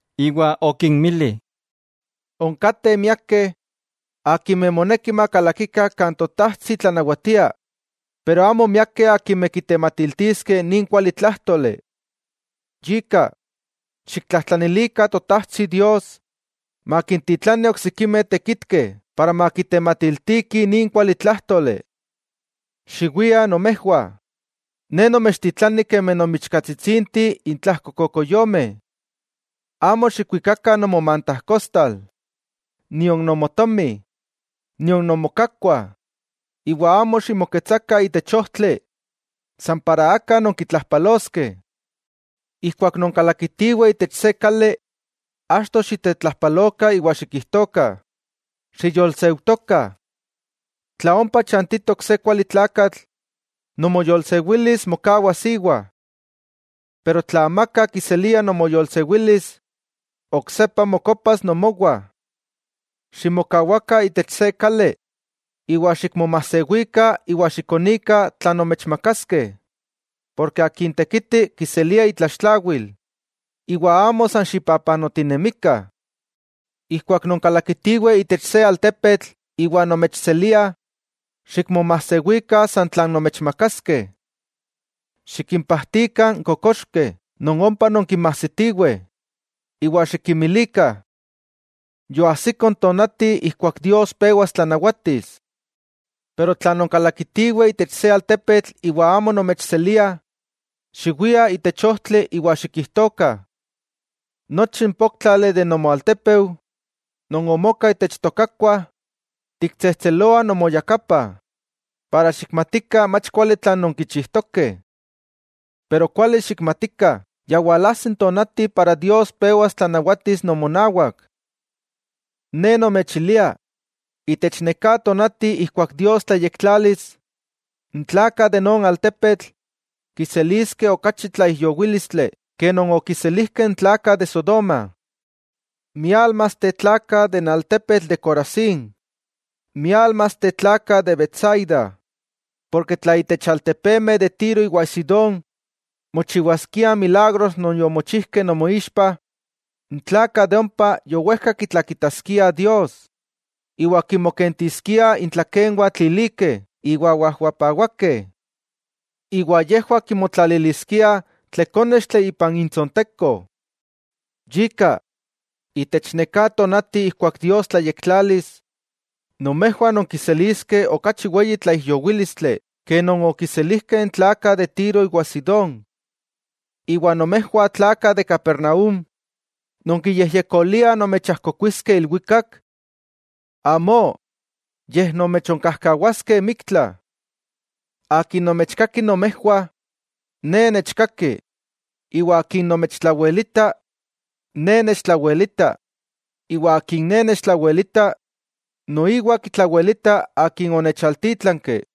Iwa okinmili: —Onkateh miakeh akimeh moneki makalakikah kan Totajtsi tlanawatia, pero amo miakeh akimeh kitematiltiskeh nin kualitlájtoli. Yika, xiktlajtlanilikah Totajtsi Dios makintitlani oksikimeh tekitkeh para makitematiltiki nin kualitlájtoli. Xiwiah nomejwah, Ne nomechtitlani kemi nonmichkatsitsinteh intlajko kokoyomeh. Amo xikwikakah nomomantajkostal nion nomotomi, nion nomokakkuah; iwa amo ximoketsakah itech ojtli san para aka nonkitlajpaloskeh. Ijkuak nonkalakitiweh itech se kali, achto xitetlajpalokah iwa xikijtokah: “Xiyolseutokah.” Tla ompa chantitok se kuali tlakatl, nomoyolsewilis mokawas íwa. Pero tla amaka kiselia nomoyolsewilis, oksepa mokopas nomowah. Ximokawakah itech se kali, iwa xikmomasewikah iwa xikonikah tlan nomechmakaskeh, porke akin tekiti kiselia itlaxtlawil, iwa amo san xipapanotinemikah. Ijkuak nonkalakitiweh itech se altepetl iwa nomechseliah, xikmomajsewikah san tlan nomechmakaskeh. Xikimpajtikah n kokoxkeh non ompa nonkinmajsitiweh, iwa xikinmilikah: “Yoajsiko n tonati ijkuak Dios pewas tlanawatis.” Pero tla nonkalakitiweh itech se altepetl iwa amo nomechseliah, xiwiah itech ojtli iwa xikijtokah: “Nochi n póktlali de nomoaltepeu non omoka itech tokakuah, tiktsejtseloah nomoyakapah para xikmatikah mach kuali tlan nonkichijtokeh. Pero kuali xikmatikah ya walajsi n tonati para Dios pewas tlanawatis nomonawak.” Ne nomechilia, itech neká tonati ijkuak Dios tlayektlalis, n tlakah de non altepetl kiseliskeh okachi tlaijyowílistli ke non okiselijkeh n tlakah de Sodoma. '¡Miálmasteh tlakah de n altepetl de Corazín! ¡Miálmasteh tlakah de Betsaida! Porke tla itech altepemeh de Tiro iwa Sidón mochiwaskiah n milagros non yomochijkeh nomoixpa, n tlakah de ompa yowejka kitlakitaskiah Dios. Iwa kinmokentiskiah intlakenwah tlilikeh iwa wajwapawakeh. Iwa yejwah kimotlaliliskiah tlekónextli ipan intsonteko. Yika, itech neká tonati ijkuak Dios tlayektlalis, nomejwah nonkiseliskeh okachi weyi tlaijyowílistli ke non okiselijkeh n tlakah de Tiro iwa Sidón. Iwa nomejwah tlakah de Capernaúm, ¿nonkiyejyekoliah nomechajkokuiskeh ilwikak? ¡Amó!, yej nomechonkajkawaskeh miktla. 'Akin nomechkaki nomejwah, Ne nechkaki, iwa akin nomechtlawelita, Ne nechtlawelita, iwa akin Ne nechtlawelita noiwa kitlawelita Akin onechaltítlanki.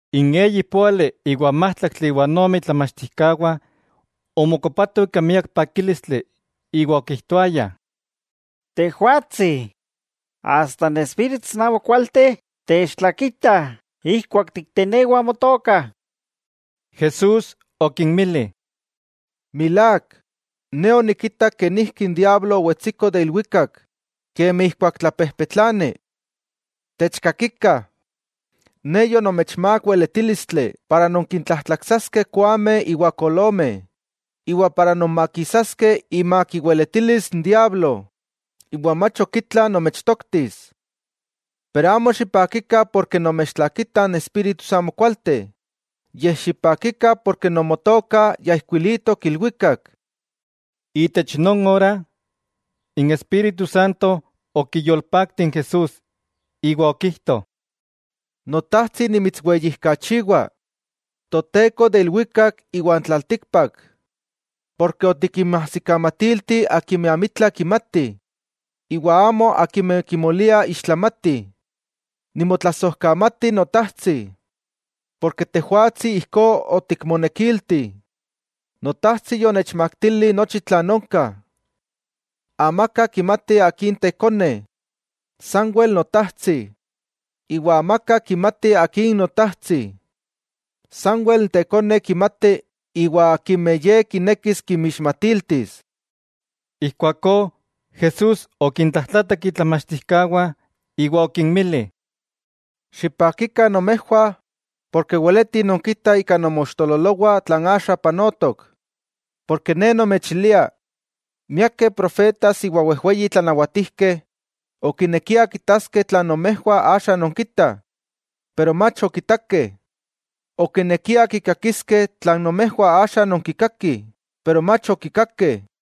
N eyi póali iwa n májtlaktli iwa n ome itlamachtijkawah omokopatoh ika miak pakílistli iwa okijtoayah: —Tejwatsi, asta n espíritus amokualteh techtlakitah ijkuak tiktenewah Motoka. Jesús okinmili: —Milák, Ne onikitak kenijki n diablo owetsiko de ilwikak kemi ijkuak tlapejpetlani. ¡Techkakikah! Ne yonomechmák weletílistli para nonkintlajtlaksaskeh koameh iwa kolomeh, iwa nonmakisaskeh imak iweletilis n diablo, iwa mach ok itla nomechtoktis. Pero amo xipakikah porke nomechtlakitah n espíritus amokualteh, yej xipakikah porke nomotokah ya ijkuilitok ilwikak. Itech non ora, n Espíritu Santo okiyolpakti n Jesús, iwa okijto: —Notajtsi nimitsweyijkachiwa, Toteko de ilwikak iwan tlaltíkpak, porke otikinmajsikamatilti akimeh amitla kimatih iwa amo akimeh kimoliah ixtlamatih. Nimotlasojkamati Notajtsi, porke Tejwatsi ijkó otikmonekilti. 'Notajtsi yonechmaktili nochi tlan onka. Amaka kimati Akin Tekone, sanwel Notajtsi. Iwa amaka kimati Akin Notajtsi, sanwel n Tekone kimati iwa akimeh Ye kinekis kinmixmatiltis. Ijkuakó Jesús okintlajtlatak itlamachtijkawah iwa okinmili: —¡Xipakikah nomejwah porke weletih nonkitah ika nomoixtololowah tlan axa panotok! Ne nomechilia miakeh profetas iwa wejweyi tlanawatijkeh okinekiah kitaskeh tlan nomejwah axa nonkitah, iwa mach okitakeh; okinekiah kikakiskeh tlan nomejwah axa nonkikakih, iwa mach okikakeh.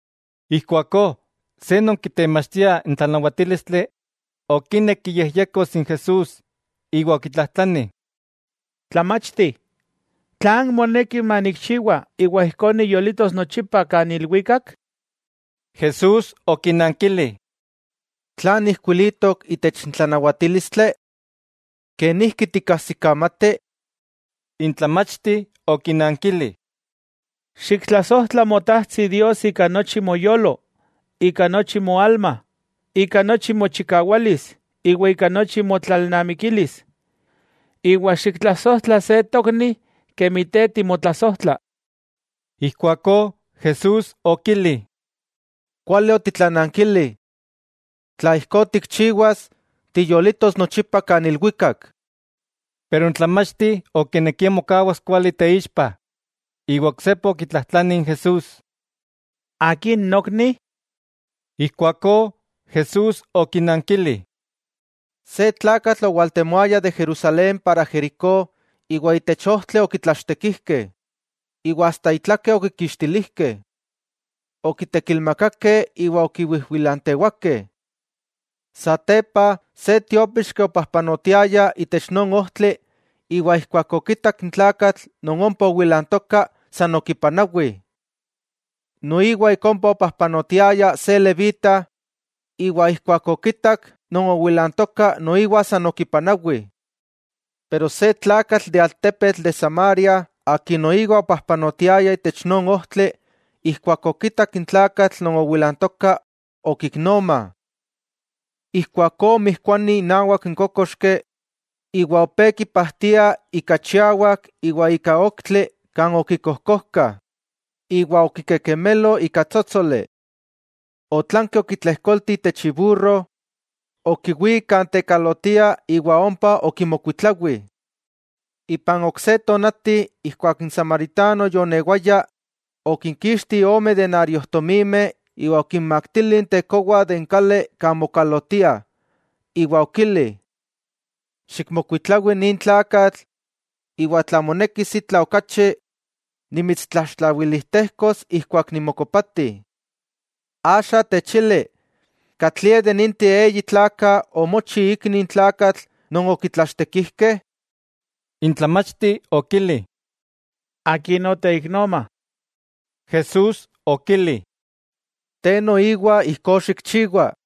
Ijkuakó se non kitemachtia n tlanawatílistli okinek kiyejyekos n Jesús iwa okitlajtlani: —Tlamachti, ¿tlan moneki manikchiwa iwa ijkó niyolitos nochipa kan ilwikak? Jesús okinankili: —¿Tlan ijkuilitok itech n tlanawatílistli? ¿Kenijki tikkajsikamati? N tlamachti okinankili: —“Xiktlasojtla Motajtsi Dios ika nochi moyolo, ika nochi moalma, ika nochi mochikawalis iwa ika nochi motlalnamikilis, iwa xiktlasojtla se tokni kemi te timotlasojtla.” Ijkuakó Jesús okili: —Kuali otitlanankili. Tla ijkó tikchiwas, tiyolitos nochipa kan ilwikak. Pero n tlamachti okinekia mokawas kuali teixpa, iwa oksepa okitlajtlani n Jesús: —¿Akin nokni? Ijkuakó Jesús okinankili: —Se tlakatl owaltemoaya de Jerusalén para Jericó, iwa itech ojtli okitlachtekijkeh, iwa asta itlake okikixtilijkeh. Okitekilmakakeh iwa okiwijwilantewakeh. 'Satepa, se tiópixki opajpanotiaya itech non ojtli, iwa ijkuak okitak n tlakatl non ompa owilantoka, san okipanawi. Noiwa ik ompa opajpanotiaya se levita, iwa ijkuak okitak non owilantoka noiwa san okipanawi. Pero se tlakatl de altepetl de Samaria akin noiwa opajpanotiaya itech non ojtli, ijkuak okitak n tlakatl non owilantoka okiknoma. Ijkuakó omijkuani inawak n kókoxki, iwa opé kipajtia ika chiawak iwa ika oktli kan okikojkojkah, iwa okikekemelo ika tsótsoli. Otlanki okitlejkolti itech iburro, okiwík kan tekalotiah iwa ompa okimokuitlawi. Ipan ok se tonati, ijkuak n samaritano yoonewaya, okinkixti ome denariojtomimeh iwa okinmaktili n tekowa itech kali kan mokalotiah, iwa okili: “Xikmokuitlawi nin tlakatl, iwa tla monekis itla okachi, nimitstlaxtlawilijtejkos ijkuak nimokopati.” Axa, techili ¿katlie de ninteh eyi tlakah omochi ikni n tlakatl non okitlachtekijkeh? N tlamachti okili: —Akin oteiknoma. Jesús okili: —Te noiwa ijkó xikchiwa.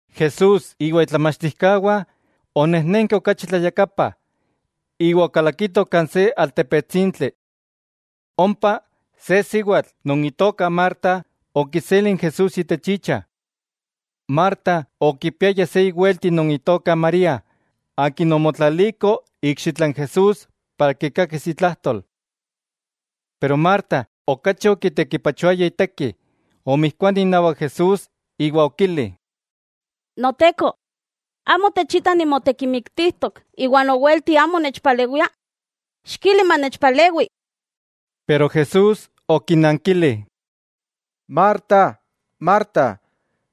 Jesús iwa itlamachtijkawah onejnenkeh okachi tlayakapa, iwa okalakitoh kan se altepetsintli. Ompa, se siwatl non itoka Marta okiseli n Jesús itech icha. Marta okipiaya se iwelti non itoka María akin omotlaliko ikxitla n Jesús para kikakis itlajtol. Pero Marta okachi okitekipachoaya iteki, omijkuani inawak Jesús iwa okili: —Noteko, ¿amo techita nimotekimiktijtok iwa nowelti amo nechpalewia? Xikili manechpalewi. Pero Jesús okinankili: —Marta, Marta,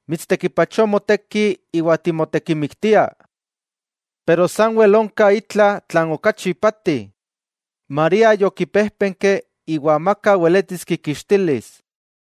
mitstekipachoa moteki iwa timotekimiktia, pero sanwel onka itla tlan okachi ipati. María yokipéjpenki, iwa amaka weletis kikixtilis.